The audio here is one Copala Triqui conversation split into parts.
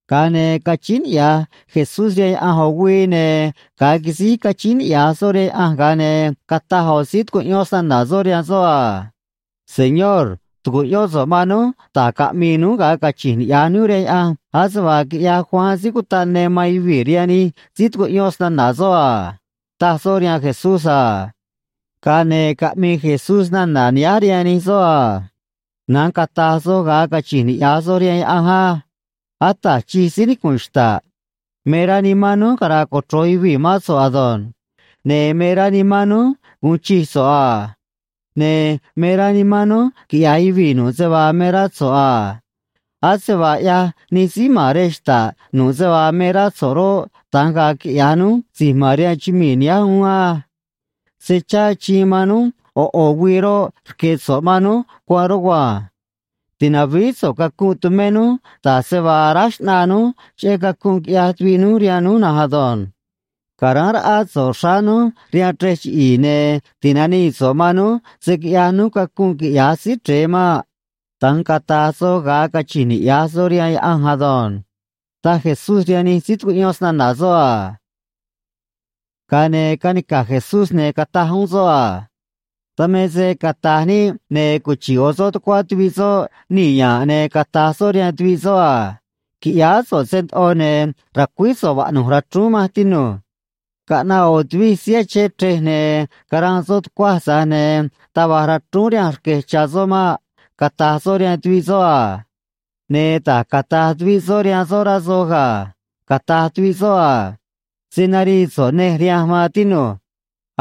Ga̱a ne̱ cachíín niꞌya̱j Jesús rihaan Yaꞌanj ꞌo̱ güii, ne̱ ga̱a quisíj cachíín niꞌya̱j soꞌ rihaan Yaꞌanj, ga̱a ne̱ cataj ꞌo̱ síí tucuꞌyón snana̱ soꞌ rihaan soꞌ a: ―Señor, tu̱cuꞌyón so̱ꞌ man núj da̱j caꞌmi̱i̱ núj ga̱a cachi̱nj niꞌya̱j núj rihaan Yaꞌanj, ase vaa quiꞌyaj Juan Síí Cutaꞌ Ne man yuvii̱ rihaan nij síí tucuꞌyón snana̱ soꞌ a ―taj soꞌ rihaan Jesús a. Ga̱a ne̱ caꞌmii Jesús nana̱ nihánj rihaan nij soꞌ a: ―Na̱nj cata̱j soj ga̱a cachi̱nj niꞌya̱j soj rihaan Yaꞌanj á: Ata̱j Chij, síí nicu̱nꞌ xta̱ꞌ, me rá nimán núj cara̱a̱ cochro̱j yuvii̱ mán so̱ꞌ ado̱nj. Ne̱ me rá nimán núj gu̱un chij so̱ꞌ a. Ne̱ me rá nimán núj quiꞌya̱j yuvii̱ nu̱ꞌ se vaa me rá so̱ꞌ a. Ase vaa ꞌyaj nij síí ma̱n rej xta̱ꞌ nu̱ꞌ se vaa me rá so̱ꞌ roꞌ, da̱nj ga̱a̱ quiꞌya̱j núj si̱j ma̱n rihaan chumii̱ nihánj uún á. Se chá achiin man núj ꞌo̱ ꞌo̱ güii roꞌ, rque̱ so̱ꞌ man núj cuanꞌ rugua̱nj. Ti̱navíí so̱ꞌ cacunꞌ tumé núj, da̱j se vaa aráj xꞌnaa núj cheꞌé cacunꞌ quiꞌyaj tuviꞌ núj rihaan núj na̱nj ado̱nj. Ca̱ráán raꞌá so̱ꞌ xráá núj rihaan chrej chiꞌi̱i̱, ne̱ ti̱nanii so̱ꞌ man núj se̱ quiꞌyaj núj cacunꞌ, quiꞌya̱j Síí Chre̱e maꞌ. Da̱nj cata̱j soj ga̱a cachi̱nj niꞌya̱j soj rihaan Yaꞌanj ado̱nj ―taj Jesús rihaan nij síí tucuꞌyón snana̱ soꞌ a. Ga̱a ne̱ canica̱j Jesús, ne̱ cataj uún soꞌ a: ―Dan me se cata̱j níꞌ, ne̱ cuchi̱ꞌ ꞌo̱ soꞌ tucuá tuviꞌ soꞌ nii̱ ya̱nꞌ, ne̱ cata̱j soꞌ rihaan tuviꞌ soꞌ a: “Qui̱ꞌyáá so̱ꞌ se ndoꞌo, ne̱ ra̱cuíj so̱ꞌ vaꞌnu̱j rachrúún manj, tinu̱j. Caꞌnaꞌ ꞌo̱ tuvij síí achén chrej, ne̱ caranꞌ soꞌ tucuaj, tza̱j ne̱ taj va̱j rachrúún rihanj rque̱j cha̱ soꞌ maꞌ”, cata̱j soꞌ rihaan tuviꞌ soꞌ a. Ne̱ da̱j cata̱j tuviꞌ soꞌ rihaan soꞌ, rá soj ga̱. Cata̱j tuviꞌ soꞌ a: “Se̱ narii so̱ꞌ nej rihanj, maan tinu̱j.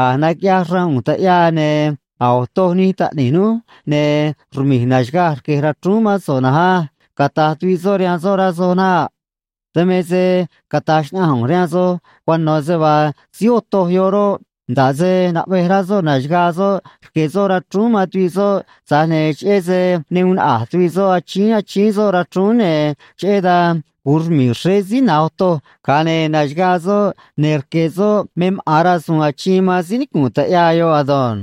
A̱j naquiꞌyaj xraan ꞌu̱nj taꞌyaa, ne̱ a̱j otoj nij taꞌni̱j núj, ne̱ rmi̱j na̱xagaj rque̱j rachrúún mán so̱ꞌ na̱nj á”, cata̱j tuviꞌ soꞌ rihaan soꞌ, rá soj naꞌ. Dan me se cata̱j xnaꞌanj ꞌu̱nj rihaan soj cuano̱ se vaa síí otoj yoꞌ roꞌ, nda̱ꞌ se naꞌvej rá soꞌ na̱xagaa soꞌ rque̱ soꞌ rachrúún man tuviꞌ soꞌ, tza̱j ne̱ cheꞌé se ne uun naꞌa̱j tuviꞌ soꞌ achíín achíín soꞌ rachrúún, ne̱ cheꞌé dan gu̱un rmi̱i̱ xréé síí na̱j otoj, ga̱a ne̱ na̱xagaa soꞌ, ne̱ rque̱ soꞌ me maꞌa̱n rasu̱u̱n achiin man síí nicu̱nꞌ taꞌyaa yoꞌ ado̱nj.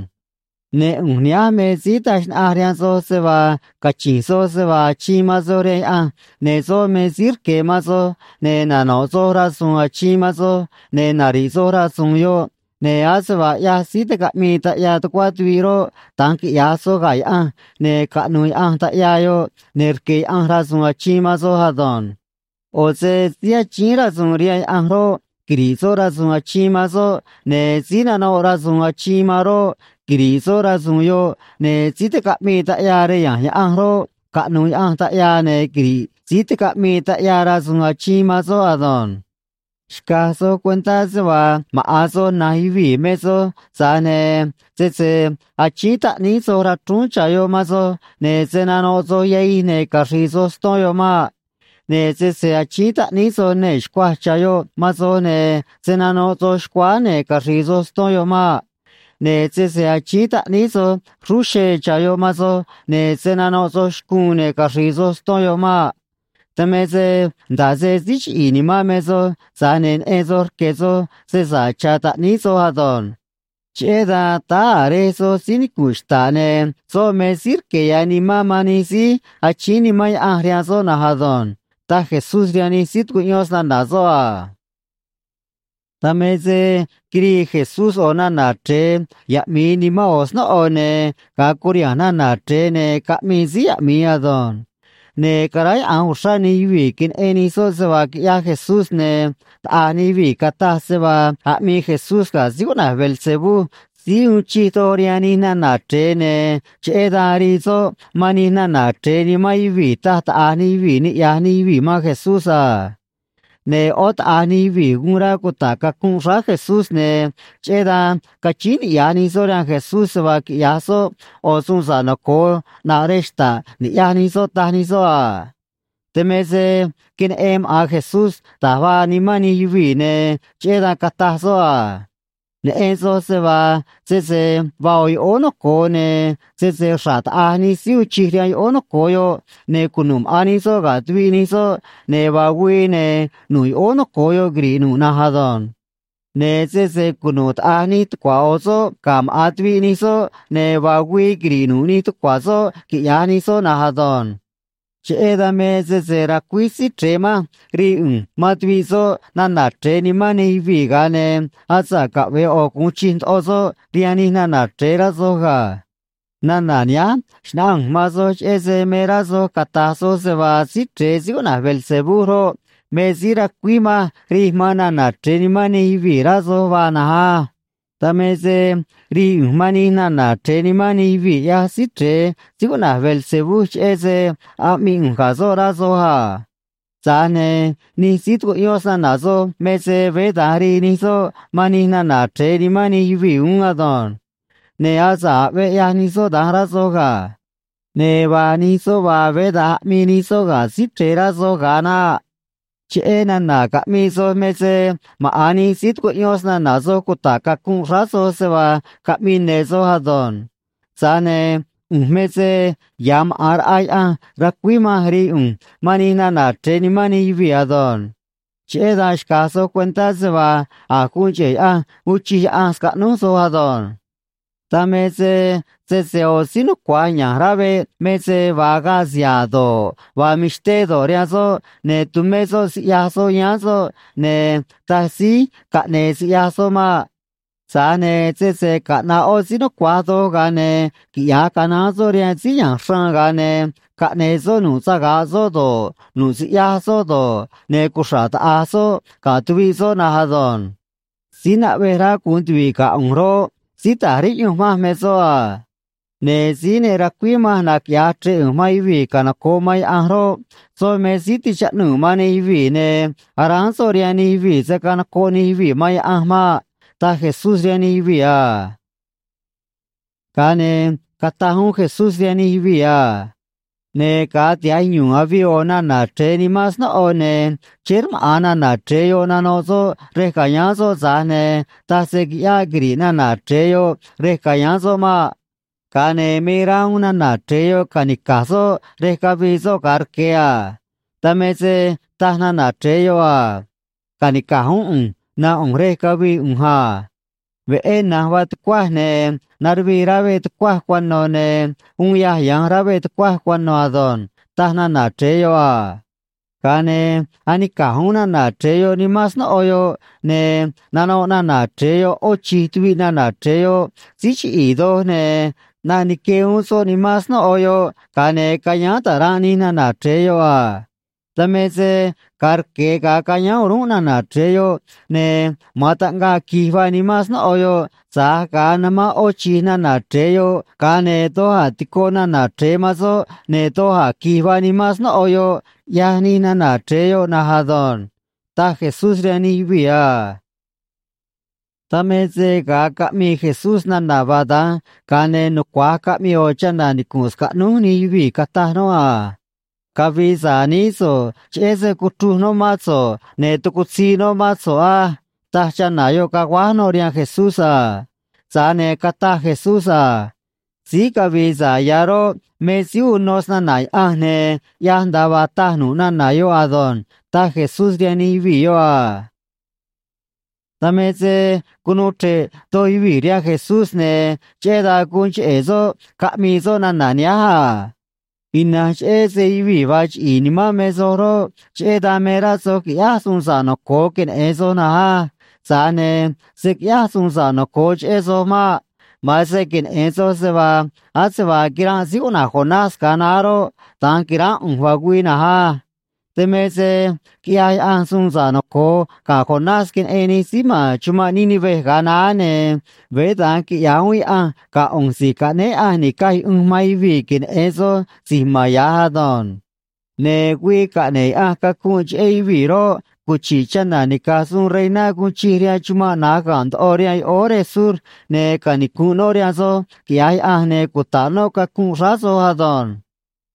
’Ne̱ ꞌu̱nj nihánj me síí taj xnaꞌanj rihaan soj se vaa cachi̱nj soj se vaa achiin man soj rihaan Yaꞌanj, ne̱ soꞌ me síí rque̱ man soj, ne̱ nano̱ꞌ soj rasu̱u̱n achiin man soj, ne̱ nari̱ꞌ soj rasu̱u̱n yoꞌ, ne̱ ase vaa ꞌyaj síí ticaꞌmii taꞌyaa tucuá tuviꞌ roꞌ, da̱nj quiꞌya̱j soj ga̱ Yaꞌanj, ne̱ caꞌnu̱u̱ Yaꞌanj taꞌyaa yoꞌ, ne̱ rque̱ Yaꞌanj rasu̱u̱n achiin man soj ado̱nj. ꞌO̱ se síí achíín rasu̱u̱n rihaan Yaꞌanj roꞌ, quiri̱ꞌ soꞌ rasu̱u̱n achiin man soꞌ, ne̱ síí nanoꞌ rasu̱u̱n achiin man roꞌ, quiri̱ꞌ soꞌ rasu̱u̱n yoꞌ, ne̱ síí ticaꞌmii taꞌyaa rej ya̱nj Yaꞌanj roꞌ, caꞌnu̱u̱ Yaꞌanj taꞌyaa, ne̱ quiri̱ꞌ síí ticaꞌmii taꞌyaa rasu̱u̱n achiin man soꞌ ado̱nj. ’Xca̱j soj cuentá se vaa maꞌa̱n soj, na̱nj yuvii̱ me soj, tza̱j ne̱ sese achíín taꞌníí soj rachrúún cha̱ yoꞌ man soj, ne̱ se̱ nanoꞌ soj yahij ne̱ caxri̱i̱ soj ston yoꞌ maꞌ. Ne̱ sese achíín taꞌníí soj nee̱ xcuaj cha̱ yoꞌ man soj, ne̱ se̱ nanoꞌ soj xcuáá ne̱ caxri̱i̱ soj ston yoꞌ maꞌ. Ne̱ sese achíín taꞌníí soj xrúú xee cha̱ yoꞌ man soj, ne̱ se̱ nanoꞌ soj xcuun ne̱ caxri̱i̱ soj ston yoꞌ maꞌ. Dan me se nda̱ꞌ se síí chiꞌi̱i̱ nimán me soj, tza̱j ne̱ neꞌen soj rque̱ soj se sa̱ꞌ cha̱ taꞌníí soj ado̱nj. Cheꞌé dan táá a̱ Rej soj síí nicu̱nꞌ xta̱ꞌ, ne̱ soꞌ me síí rque̱ ya̱ Nimán man nij síí achíín Nimán Yaꞌanj rihaan soꞌ na̱nj ado̱nj ―taj Jesús rihaan nij síí tucuꞌyón snana̱ soꞌ a. Dan me se quirii Jesús ꞌo̱ nana̱ chre̱e yaꞌmi̱i nimán ꞌo̱ snóꞌo, ne̱ ga̱a curiha̱nj nana̱ chre̱e, ne̱ caꞌmii síí yaꞌmi̱i ado̱nj. Ne̱ caráyaꞌa̱nj uxrá nij yuvii̱ queneꞌen nij soꞌ se vaa quiꞌyaj Jesús, ne̱ taꞌa̱j nij yuvii̱ cataj se vaa aꞌmii Jesús ga̱ síí cuꞌna̱j Beelzebú, síí uun chij doj rihaan nij nana̱ chre̱e, ne̱ cheꞌé dan rii soꞌ man nij nana̱ chre̱e nimán yuvii̱, taj taꞌa̱j nij yuvii̱, niꞌya̱j nij yuvii̱ man Jesús a. Ne̱ ꞌó taꞌa̱j nij yuvii̱ guun rá cuta̱ꞌ cacunꞌ xráá Jesús, ne̱ cheꞌé dan cachíín niꞌya̱j nij soꞌ rihaan Jesús se vaa quiꞌya̱j soꞌ ꞌo̱ suun sa̱ꞌ noco̱o ꞌnaꞌ rej xta̱ꞌ ni̱ꞌyaj nij soꞌ, taj nij soꞌ a. Dan me se queneꞌen maꞌa̱n Jesús da̱j vaa nimán nij yuvii̱, ne̱ cheꞌé dan cataj soꞌ a: ―Neꞌen soj se vaa sese vaa ꞌo̱ yoꞌóó noco̱o, ne̱ sese xra̱ꞌ taꞌa̱j nij síí uun chij rihaan yoꞌóó noco̱o yoꞌ ne̱ cunu̱ꞌ maꞌa̱n nij soꞌ ga̱ tuviꞌ nij soꞌ, ne̱ vaa güii, ne̱ nu̱ꞌ yoꞌóó noco̱o yoꞌ quiri̱ꞌ nu̱ꞌ na̱nj ado̱nj. Ne̱ sese cunu̱ꞌ taꞌa̱j nij tucua̱ ꞌo̱ soꞌ ga̱ maꞌa̱n tuviꞌ nij soꞌ, ne̱ vaa güii quiri̱ꞌ nu̱ꞌ nij tucua̱ soꞌ, quiꞌya̱j nij soꞌ na̱nj ado̱nj. Cheꞌé dan me sese racuíj Síí Chre̱e manj rii ꞌu̱nj man tuviꞌ soꞌ nana̱ chre̱e nimán nij yuvii̱, ga̱a ne̱ asa̱ꞌ caꞌve̱e ꞌo̱ gu̱un chij ndoꞌo soꞌ rihaan nij nana̱ chre̱e, rá soj ga̱. Nana̱ nihánj xnáꞌanj ꞌu̱nj man soj cheꞌé se me rá soj cata̱j soj se vaa Síí Chre̱e síí cuꞌna̱j Beelzebú roꞌ, me síí racuíj manj rij man nana̱ chre̱e nimán nij yuvii̱, rá soj vaa na̱nj á. Dan me se rii ꞌu̱nj man nij nana̱ chre̱e nimán nij yuvii̱, ꞌyaj Síí Chre̱e, síí cuꞌna̱j Beelzebú, cheꞌé se aꞌmii ꞌu̱nj ga̱ soꞌ, rá soj a. Tza̱j ne̱ nij síí tucuꞌyón snana̱ soj me se veé da̱nj rii nij soꞌ man nij nana̱ chre̱e nimán nij yuvii̱ uún ado̱nj. Ne̱ asa̱ꞌ aꞌvee ꞌyaj nij soꞌ da̱nj, rá soj ga̱. Ne̱ vaa nij soꞌ vaa, veé da̱nj aꞌmii nij soꞌ ga̱ Síí Chre̱e, rá soj ga̱a naꞌ. Cheꞌé nana̱ caꞌmii soj me se maꞌa̱n nij síí tucuꞌyón snana̱ soj cuta̱ꞌ cacunꞌ xráá soj se vaa caꞌmii ne̱ soj ado̱nj. Tza̱j ne̱ ꞌu̱nj me se ya̱ maꞌa̱n raꞌa Yaꞌanj racuíj manj rii ꞌu̱nj man nij nana̱ chre̱e nimán nij yuvii̱ ado̱nj. Cheꞌé dan xca̱j soj cuentá se vaa a̱j guun cheꞌe̱ Yaꞌanj uun chij Yaꞌanj scaꞌnúj soj ado̱nj. ’Dan me se sese ꞌo̱ síí nucua̱j ya̱nj rá veꞌ me se vaa agaꞌ siha̱a̱ do̱ꞌ, vaa mixté do̱ꞌ, rihaan soꞌ, ne̱ tumé soꞌ siꞌyaj soꞌ yáán soꞌ, ne̱ taj síí caꞌne̱e̱ siꞌyaj soꞌ maꞌ. Tza̱j ne̱ sese caꞌna̱ꞌ ꞌó síí nucua̱j doj, ga̱a ne̱ quiꞌya̱j canaán soꞌ rihaan síí ya̱nj xraan, ga̱a ne̱ caꞌne̱e̱ soꞌ nu̱ꞌ saga̱ꞌ soꞌ do̱ꞌ, nu̱ꞌ siꞌyaj soꞌ do̱ꞌ, ne̱ cuxra̱ꞌ taꞌa̱j soꞌ ga̱ tuviꞌ soꞌ na̱nj ado̱nj. ’Síí naꞌvej rá gu̱un tuvi̱ꞌ ga̱ ꞌu̱nj roꞌ, síí ta̱j riꞌyunj manj me soꞌ a. Ne̱ síí ne racuíj manj naquiꞌya̱j chre̱ꞌ ꞌu̱nj man yuvii̱ canoco̱ꞌ man Yaꞌanj roꞌ, soꞌ me síí tichaꞌnuu̱ man nij yuvii̱, ne̱ aráán soꞌ rihaan nij yuvii̱ se̱ canocoꞌ nij yuvii̱ man Yaꞌanj maꞌ ―taj Jesús rihaan nij yuvii̱ a. Ga̱a ne̱ cataj uún Jesús rihaan nij yuvii̱ a: ―Ne̱ ga̱a tiha̱j yu̱u̱n avii ꞌo̱ nana̱ chre̱e nimán snóꞌo, ne̱ chéé rmaꞌa̱n nana̱ chre̱e yoꞌ nanoꞌ soꞌ rej ca̱yáán soꞌ, tza̱j ne̱ taj se qui̱ꞌyáꞌ quiri̱ꞌ nana̱ chre̱e yoꞌ rej ca̱yáán soꞌ maꞌ. Ga̱a ne̱ me rá uún nana̱ chre̱e yoꞌ ca̱nica̱j soꞌ rej cavii soꞌ ga̱a rque̱ a. Dan me se taj nana̱ chre̱e yoꞌ a: “Ca̱nica̱j uún ꞌu̱nj nánꞌ ꞌu̱nj rej cavii ꞌu̱nj a. Veꞌé na̱nj vaa tucuaj, ne̱ naruvii rá veꞌ tucuaj cuano̱, ne̱ uun yâj ya̱nj rá veꞌ tucuaj cuano̱ ado̱nj”, taj nana̱ chre̱e yoꞌ a. Ga̱a ne̱ anica̱j uún nana̱ chre̱e yoꞌ nimán snóꞌo yoꞌ, ne̱ nanoꞌ nana̱ chre̱e yoꞌ ꞌó chi̱j tuviꞌ nana̱ chre̱e yoꞌ síí chiꞌi̱i̱ doj, ne̱ ꞌnaꞌ nique uún soꞌ nimán snóꞌo yoꞌ, ga̱a ne̱ ca̱yáán ta̱ranꞌ nij nana̱ chre̱e yoꞌ a. Dan me se ga̱a rque̱ ga̱a cayáán o̱rúnꞌ nana̱ chre̱e yoꞌ, ne̱ ma̱an taꞌngaꞌ qui̱j vaa nimán snóꞌo yoꞌ, tza̱j ga̱a namán ꞌó chi̱j nana̱ chre̱e yoꞌ, ga̱a ne̱ doj a̱ tico nana̱ chre̱e man soꞌ, ne̱ doj a̱ qui̱j vaa nimán snóꞌo yoꞌ, ꞌyaj nij nana̱ chre̱e yoꞌ na̱nj ado̱nj ―taj Jesús rihaan nij yuvii̱ a. Dan me se ga̱a caꞌmii Jesús nana̱ vaa da̱nj, ga̱a ne̱ nucua̱j caꞌmii ꞌo̱ chana̱ nicu̱nꞌ scaꞌnúj nij yuvii̱, cataj noꞌ a: ―Cavi̱i̱ sa̱ꞌ nií so̱ꞌ, cheꞌé se cuchruj noꞌ mán so̱ꞌ, ne̱ tucutzii noꞌ mán so̱ꞌ á ―taj chana̱ yoꞌ, caguáj noꞌ rihaan Jesús a. Tza̱j ne̱ cataj Jesús a: ―Síí cavi̱i̱ sa̱ꞌ ya̱ roꞌ, me síí uno snana̱ Yaꞌanj ne̱ ꞌyaj nda̱a vaa taj nu̱ꞌ nana̱ yoꞌ ado̱nj ―taj Jesús rihaan nij yuvii̱ yoꞌ a. Dan me se cunuu chre̱ꞌ doj yuvii̱ rihaan Jesús, ne̱ cheꞌé dan guun cheꞌe̱ soꞌ caꞌmii soꞌ nana̱ nihánj a: ―Ina̱nj cheꞌé se yuvii̱ vaa chiꞌi̱i̱ nimán me soj roꞌ, cheꞌé dan me rá soj qui̱ꞌyáj suun sa̱ꞌ noco̱o queneꞌe̱n soj na̱nj á. Tza̱j ne̱ se̱ quiꞌyáj suun sa̱ꞌ noco̱o cheꞌé soj maꞌ. Ma̱an se queneꞌe̱n soj se vaa ase vaa quiranꞌ síí cuꞌna̱j Jonás ga̱a naá roꞌ, da̱nj qui̱ránꞌ ꞌu̱nj, vaa güii na̱nj á. Dan me se quiꞌyaj Yaꞌanj suun sa̱ꞌ noco̱o ga̱ Jonás queneꞌen nij síí ma̱n chumanꞌ Nínive ga̱a naá, ne̱ veé da̱nj quiꞌya̱j uún Yaꞌanj ga̱ ꞌu̱nj Si̱j Caꞌnéé Yaꞌanj Ni̱caj Yuꞌunj man Yuvii̱, queneꞌe̱n soj si̱j ma̱n ya̱j ado̱nj. ’Ne̱ güii caꞌne̱ꞌ Yaꞌanj cacunꞌ cheꞌé yuvii̱ roꞌ, cuchi̱ꞌ chana̱ nica̱j suun reiná guun chij rihaan chumanꞌ na̱j ga̱nꞌ ndoꞌo rihaan yoꞌóó rej sur, ne̱ canicu̱nꞌ noꞌ rihaan soj, quiꞌya̱j Yaꞌanj, ne̱ cuta̱ꞌ noꞌ cacunꞌ xráá soj ado̱nj.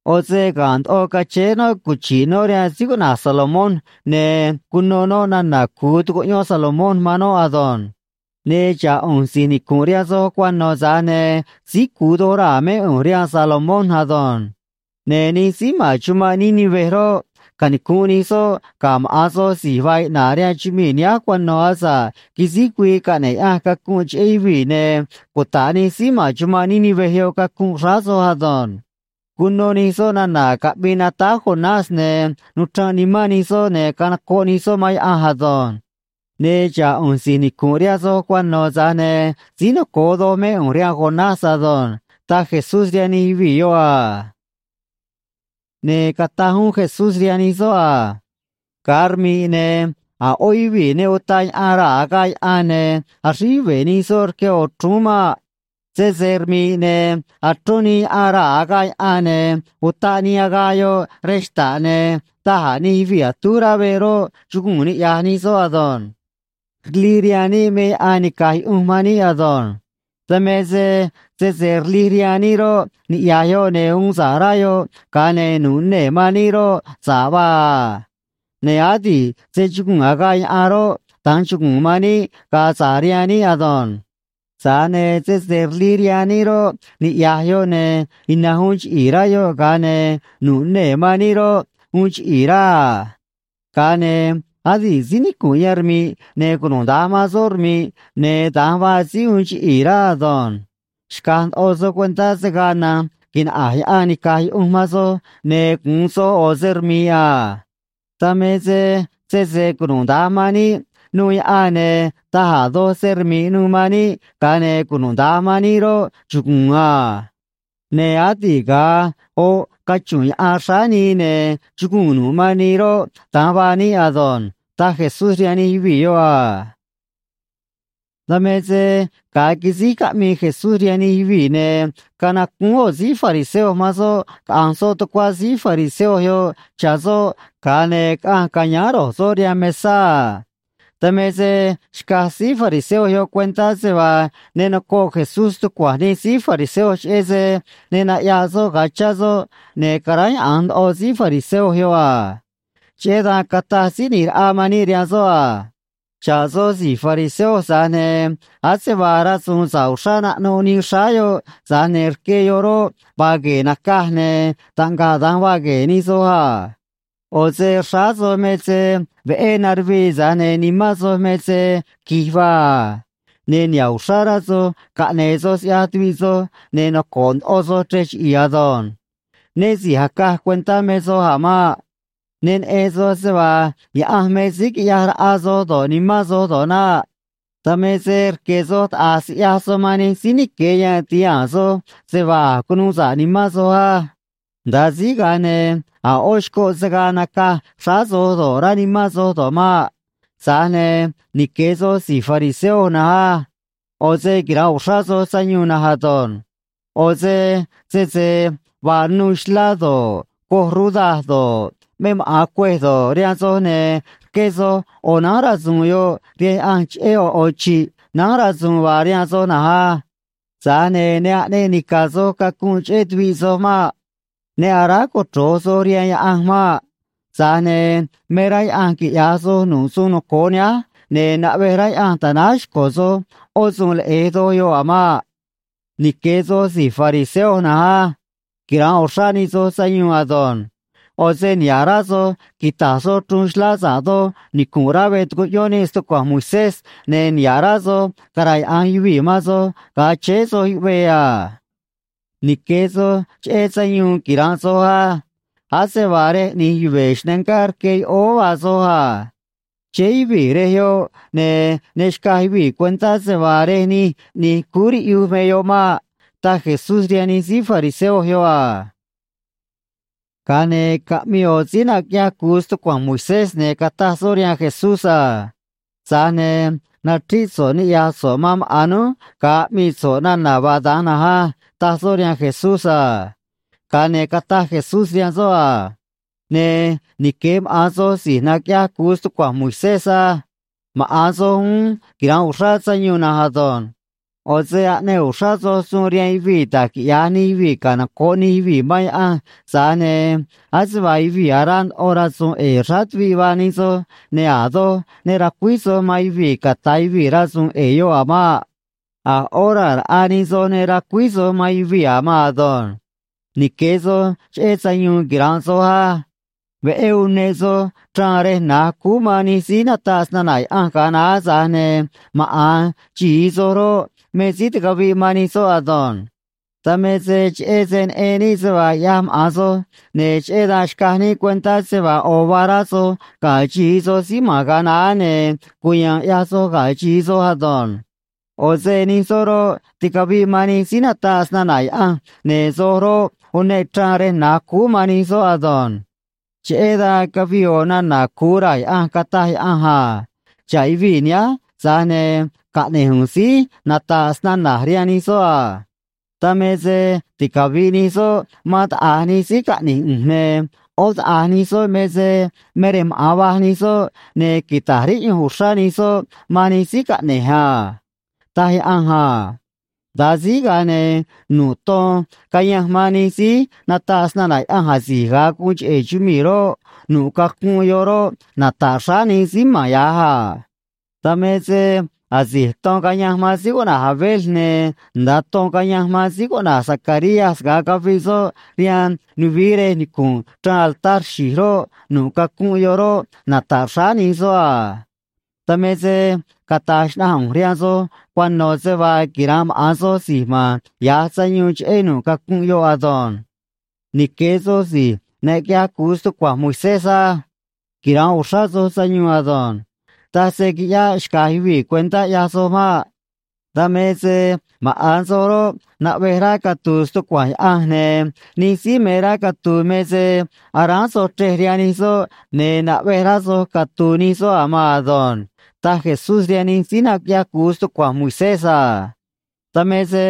ꞌO̱ se ga̱nꞌ ndoꞌo cachéé noꞌ cuchi̱ꞌ noꞌ rihaan síí cuꞌna̱j Salomón, ne̱ cuno noꞌ nana̱ cu̱u tucuꞌyón Salomón man noꞌ ado̱nj. Ne̱ xa̱ꞌ ꞌu̱nj si̱j nicu̱nꞌ rihaan soj cuano̱, tza̱j ne̱ síí cu̱u doj raa̱ mé ꞌu̱nj rihaan Salomón ado̱nj. Ne̱ nij síí ma̱n chumanꞌ Nínive roꞌ, canicu̱nꞌ nij soꞌ ga̱ maꞌa̱n soj si̱j vaa iꞌna̱ꞌ rihaan chumii̱ nihánj cuano̱ asa̱ꞌ quisíj güii caꞌne̱ꞌ Yaꞌanj cacunꞌ cheꞌé yuvii̱, ne̱ cuta̱ꞌ nij síí ma̱n chumanꞌ Nínive yoꞌ cacunꞌ xráá soj ado̱nj. Cuno nij soꞌ nana̱ caꞌmii natáj Jonás, ne̱ nuchranꞌ nimán nij soꞌ, ne̱ canocoꞌ nij soꞌ man Yaꞌanj ado̱nj. Ne̱ xa̱ꞌ ꞌu̱nj si̱j nicu̱nꞌ rihaan soj cuano̱, tza̱j ne̱ síí noco̱o doj mé ꞌu̱nj rihaan Jonás ado̱nj ―taj Jesús rihaan nij yuvii̱ yoꞌ a. Ne̱ cataj uún Jesús rihaan nij soꞌ a: ―Ga̱a rmi̱ꞌ, ne̱ a̱ ꞌó yuvii̱ ne utaꞌ yaꞌan raa̱ agaꞌ yaꞌan ne̱ axríj yuve̱ nij soꞌ rque ꞌo̱ chrúún maꞌ. Sese rmi̱ꞌ, ne̱ achrón nii yaꞌan raa̱ agaꞌ yaꞌan ne̱ utaꞌ nii agaꞌ yoꞌ rej xta̱ꞌ, ne̱ da̱j a̱ nij yuvii̱ atúj rá veꞌ roꞌ, chuguu̱n niꞌya̱j nij soꞌ ado̱nj. ’Rlij rihaan níꞌ me yaꞌan nica̱j yuꞌunj man níꞌ ado̱nj. Dan me se sese rlij rihaan níꞌ roꞌ, niꞌya̱j yoꞌ ne̱ uun sa̱ꞌ rá yoꞌ, ga̱a ne̱ nu̱ꞌ nee̱ man níꞌ roꞌ, sa̱ꞌ vaa a. Ne̱ adi̱ꞌ se chuguu̱n agaꞌ yaꞌan roꞌ, da̱nj chuguu̱n man níꞌ ga̱a sa̱ꞌ rihaan níꞌ ado̱nj. Tza̱j ne̱ sese rlij rihaan níꞌ roꞌ, niꞌya̱j yoꞌ ne̱ ina̱nj uun chiꞌi̱i̱ rá yoꞌ, ga̱a ne̱ nu̱ꞌ nee̱ man níꞌ roꞌ, uun chiꞌi̱i̱ rá a. Ga̱a ne̱ adi̱ꞌ síí nicu̱nꞌ yan rmi̱ꞌ ne̱ cunuda̱nj man soꞌ roꞌ, rmi̱ꞌ, ne̱ da̱nj vaa síí uun chiꞌi̱i̱ rá ado̱nj. Xca̱j ndoꞌo soj cuentá se̱ gaa na̱nj quinaꞌa̱j yaꞌan nica̱j yuꞌunj man soj ne̱ gu̱un soj ꞌo̱ se rmi̱ꞌ a. Dan me se sese cunuda̱nj man níꞌ nuû yaꞌan, ne̱ taj a̱ doj se rmi̱ꞌ nu̱u̱ man níꞌ, ga̱a ne̱ cunuda̱nj man níꞌ roꞌ, chuguu̱n a. Ne̱ adi̱ꞌ ga̱a oꞌ cachu̱nꞌ yaꞌan xráá nii ne̱ chuguu̱n nu̱ꞌ man nii roꞌ, da̱nj vaa níꞌ ado̱nj ―taj Jesús rihaan nij yuvii̱ yoꞌ a. Dan me se ga̱a quisíj caꞌmii Jesús rihaan nij yuvii̱, ne̱ canacúún ꞌo̱ síí fariseo man soꞌ caꞌa̱nj soꞌ tucuá síí fariseo yoꞌ cha̱ soꞌ, ga̱a ne̱ caꞌanj ca̱yáán ro̱j soꞌ rihaan mesá a. Dan me se xcaj síí fariseo yoꞌ cuentá se vaa ne nocoꞌ Jesús stucua̱nj nij síí fariseo cheꞌé se ne naꞌyaꞌ soꞌ ga̱a chá soꞌ, ne̱ caráyaꞌa̱nj ndoꞌo síí fariseo yoꞌ a. Cheꞌé dan cataj Síí ꞌNi̱j Raꞌa man níꞌ rihaan soꞌ a: ―Xa̱ꞌ soj si̱j fariseo, tza̱j ne̱ ase vaa rasu̱u̱n sa̱ꞌ uxrá naꞌnuꞌ nii xráá yoꞌ, tza̱j ne̱ rque yoꞌ roꞌ, vaa gue̱e̱ nacaj, ne̱ taꞌngaꞌ da̱nj vaa gue̱e̱ nij soj a. ꞌO̱ se xráá soj me se veꞌé naruvii, tza̱j ne̱ nimán soj me se qui̱j vaa a. Ne̱ niha̱ꞌ uxrá rá soj caꞌne̱e̱ soj siꞌyaj tuviꞌ soj, ne̱ noco̱ꞌ ndoꞌo soj chrej chiꞌi̱i̱ ado̱nj. Né si̱j acaj cuentá me soj a̱ maꞌ. Ne neꞌen soj se vaa Yaꞌanj me síí quiꞌyaj raꞌa soj do̱ꞌ, nimán soj do̱ꞌ naꞌ. Dan me se rque̱ soj taꞌa̱j siꞌya̱j soj man nij síí nique̱ yan ti̱haa̱n soj se vaa a̱j cunuu sa̱ꞌ nimán soj á. Nda̱a síj, ga̱a ne̱ a̱ ꞌó xcoꞌ se̱ gaa nacaj xráá soj do̱ꞌ, rá nimán soj do̱ꞌ maꞌ. ’Tza̱j ne̱ nique̱ soj si̱j fariseo na̱nj á. ꞌO̱ se quira̱nꞌ uxrá soj sayuun na̱nj ado̱nj. ꞌO̱ se sese vaa nuu xlá do̱ꞌ, coj ruda do̱ꞌ, me maꞌa̱n cuêj do̱ꞌ, rihaan soj, ne̱ rqué soj ꞌo̱ nánj rasu̱u̱n yoꞌ rihaan Yaꞌanj cheꞌé ꞌo̱ ꞌo̱ chi̱ꞌ nánj rasu̱u̱n vaa rihaan soj na̱nj á. Tza̱j ne̱ ne aꞌneꞌ nica̱ soj cacunꞌ cheꞌé tuviꞌ soj maꞌ. Ne aráj cochro̱j soj rihaan Yaꞌanj maꞌ. Tza̱j ne̱ me rá Yaꞌanj quiꞌya̱j soj nu̱ꞌ suun noco̱o nihánj, ne̱ naꞌvej rá Yaꞌanj ta̱náj xco̱ soj ꞌó suun leꞌe̱j doj yoꞌ a̱ maꞌ. ’Nique̱ soj si̱j fariseo na̱nj á. Quira̱nꞌ uxrá nij soj sayuun ado̱nj. ꞌO̱ se niha̱ꞌ rá soj quita̱j soj chruun xlá sa̱ꞌ doj nicu̱nꞌ rá veꞌ tucuꞌyón níꞌ stucua̱nj Moisés, ne̱ niha̱ꞌ rá soj cara̱yaꞌa̱nj yuvii̱ man soj ga̱a chéé soj yuꞌvee a. ’Nique̱ soj cheꞌé sayuun quira̱nꞌ soj á. Ase vaa rej ꞌni̱j yuve̱ xnangá rque yoꞌóó vaa soj a. Chéé yuvii̱ rej yoꞌ ne̱ ne xcaj yuvii̱ cuentá se vaa rej nij ꞌni̱j cúú riꞌyuj me yoꞌ maꞌ ―taj Jesús rihaan nij síí fariseo yoꞌ a. Ga̱a ne̱ caꞌmii ꞌo̱ síí naquiꞌyaj cu̱u stucua̱nj Moisés, ne̱ cataj soꞌ rihaan Jesús a: ―Tza̱j ne̱ nachríꞌ so̱ꞌ niꞌya̱j so̱ꞌ man maꞌa̱n núj ga̱a aꞌmii so̱ꞌ nana̱ vaa da̱nj na̱nj á ―taj soꞌ rihaan Jesús a. Ga̱a ne̱ cataj Jesús rihaan soꞌ a: ―Ne̱ nique̱ maꞌa̱n soj si̱j naquiꞌyaj cu̱u stucua̱nj Moisés á. Maꞌa̱n soj uún quira̱nꞌ uxrá sayuun na̱nj ado̱nj. ꞌO̱ se aꞌneꞌ uxrá soj suun rihaan yuvii̱ da̱j quiꞌya̱j nij yuvii̱ canoco̱ꞌ nij yuvii̱ man Yaꞌanj, tza̱j ne̱ ase vaa yuvii̱ araa ndoꞌo rasu̱u̱n ꞌe̱e̱ xráá tuviꞌ vaa nij soj, ne̱ a̱ doj ne racuíj soj man yuvii̱ ca̱ta̱ yuvii̱ rasu̱u̱n ꞌe̱e̱ yoꞌ a̱ maꞌ. A̱ ꞌó raa̱ raꞌa nij soj ne racuíj soj man yuvii̱ a̱ maan ado̱nj. ’Nique̱ soj cheꞌé sayuun quira̱nꞌ soj á. Veꞌé uneꞌ soj chraan rej na̱j cúú man nij síí nataꞌ snana̱ Yaꞌanj ga̱a naá, tza̱j ne̱ maꞌa̱n xi̱i soj roꞌ, me síí ticaviꞌ man nij soꞌ ado̱nj. Dan me se cheꞌé se neꞌen níꞌ se vaa ꞌyaj maꞌa̱n soj, ne̱ cheꞌé dan xcaj níꞌ cuentá se vaa ꞌo̱ vaa rá soj ga̱ xi̱i soj síí ma̱n ga̱a naá, ne̱ cuya̱a̱n ꞌyaj soj ga̱ xi̱i soj ado̱nj. ꞌO̱ se nij soꞌ roꞌ, ticaviꞌ man nij síí nataꞌ snana̱ Yaꞌanj, ne̱ soj roꞌ, uneꞌ chraan rej na̱j cúú man nij soꞌ ado̱nj. ’Cheꞌé dan cavii ꞌo̱ nana̱ cu̱u raa̱ Yaꞌanj, cataj Yaꞌanj a: “Xa̱ꞌ yuvii̱ nihánj, tza̱j ne̱ caꞌne̱j ꞌu̱nj síí nata̱ꞌ snana̱j rihaan nij soꞌ a. Dan me se ticavi̱ꞌ nij soꞌ man taꞌa̱j nij síí caꞌne̱j ꞌu̱nj, ne̱ ꞌó taꞌa̱j nij soꞌ me se me rej maꞌa̱n vaj nij soꞌ, ne̱ quita̱j riꞌyunj uxrá nij soꞌ man nij síí caꞌne̱j a”, taj Yaꞌanj a. Nda̱a síj, ga̱a ne̱ nu̱ꞌ ton cayanj man nij síí nataꞌ snana̱ Yaꞌanj asi̱j ga̱a guun cheꞌe̱ chumii̱ roꞌ, nu̱ꞌ cacunꞌ yoꞌ roꞌ, nata̱ꞌ xráá nij síí ma̱n ya̱j a. Dan me se asi̱j ton cayanj man síí cuꞌna̱j Abel ne̱ nda̱a ton cayanj man síí cuꞌna̱j Zacarías ga̱a caviꞌ soꞌ rihaan nuvií rej nicu̱nꞌ chraan altar xi̱j roꞌ, nu̱ꞌ cacunꞌ yoꞌ roꞌ, nata̱ꞌ xráá nij soꞌ a. Dan me se cata̱j xnaꞌanj ꞌu̱nj rihaan soj cuano̱ se vaa quira̱nꞌ maꞌa̱n soj si̱j ma̱n ya̱j sayuun cheꞌé nu̱ꞌ cacunꞌ yoꞌ ado̱nj. ’Nique̱ soj si̱j naquiꞌyaj cu̱u stucua̱nj Moisés á. Quira̱nꞌ uxrá soj sayuun ado̱nj. Taj se qui̱ꞌyáꞌ xca̱j yuvii̱ cuentá, ꞌyaj soj maꞌ. Dan me se maꞌa̱n soj roꞌ, naꞌvej rá catu̱u̱ stucua̱nj Yaꞌanj, ne̱ nij síí me rá catu̱u̱ me se aráán soj chrej rihaan nij soꞌ, ne̱ naꞌvej rá soj catu̱u̱ nij soꞌ a̱ maan ado̱nj ―taj Jesús rihaan nij síí naquiꞌyaj cu̱u stucua̱nj Moisés a. Dan me se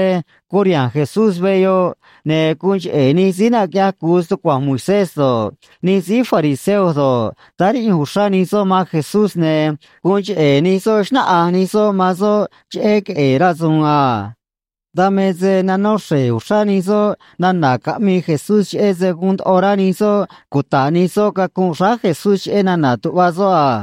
curiha̱nj Jesús veꞌ yoꞌ, ne̱ guun cheꞌe̱ nij síí naquiꞌyaj cu̱u stucua̱nj Moisés do̱ꞌ, nij síí fariseo do̱ꞌ, táá riꞌyunj uxrá nij soꞌ man Jesús, ne̱ guun cheꞌe̱ nij soꞌ xnáꞌanj nij soꞌ man soꞌ cheꞌé queꞌe̱e̱ rasu̱u̱n a. Dan me se nanó xre̱j uxrá nij soꞌ nana̱ caꞌmii Jesús cheꞌé se guun ndoꞌo rá nij soꞌ cuta̱ꞌ nij soꞌ cacunꞌ xráá Jesús cheꞌé nana̱ tuꞌva soꞌ a.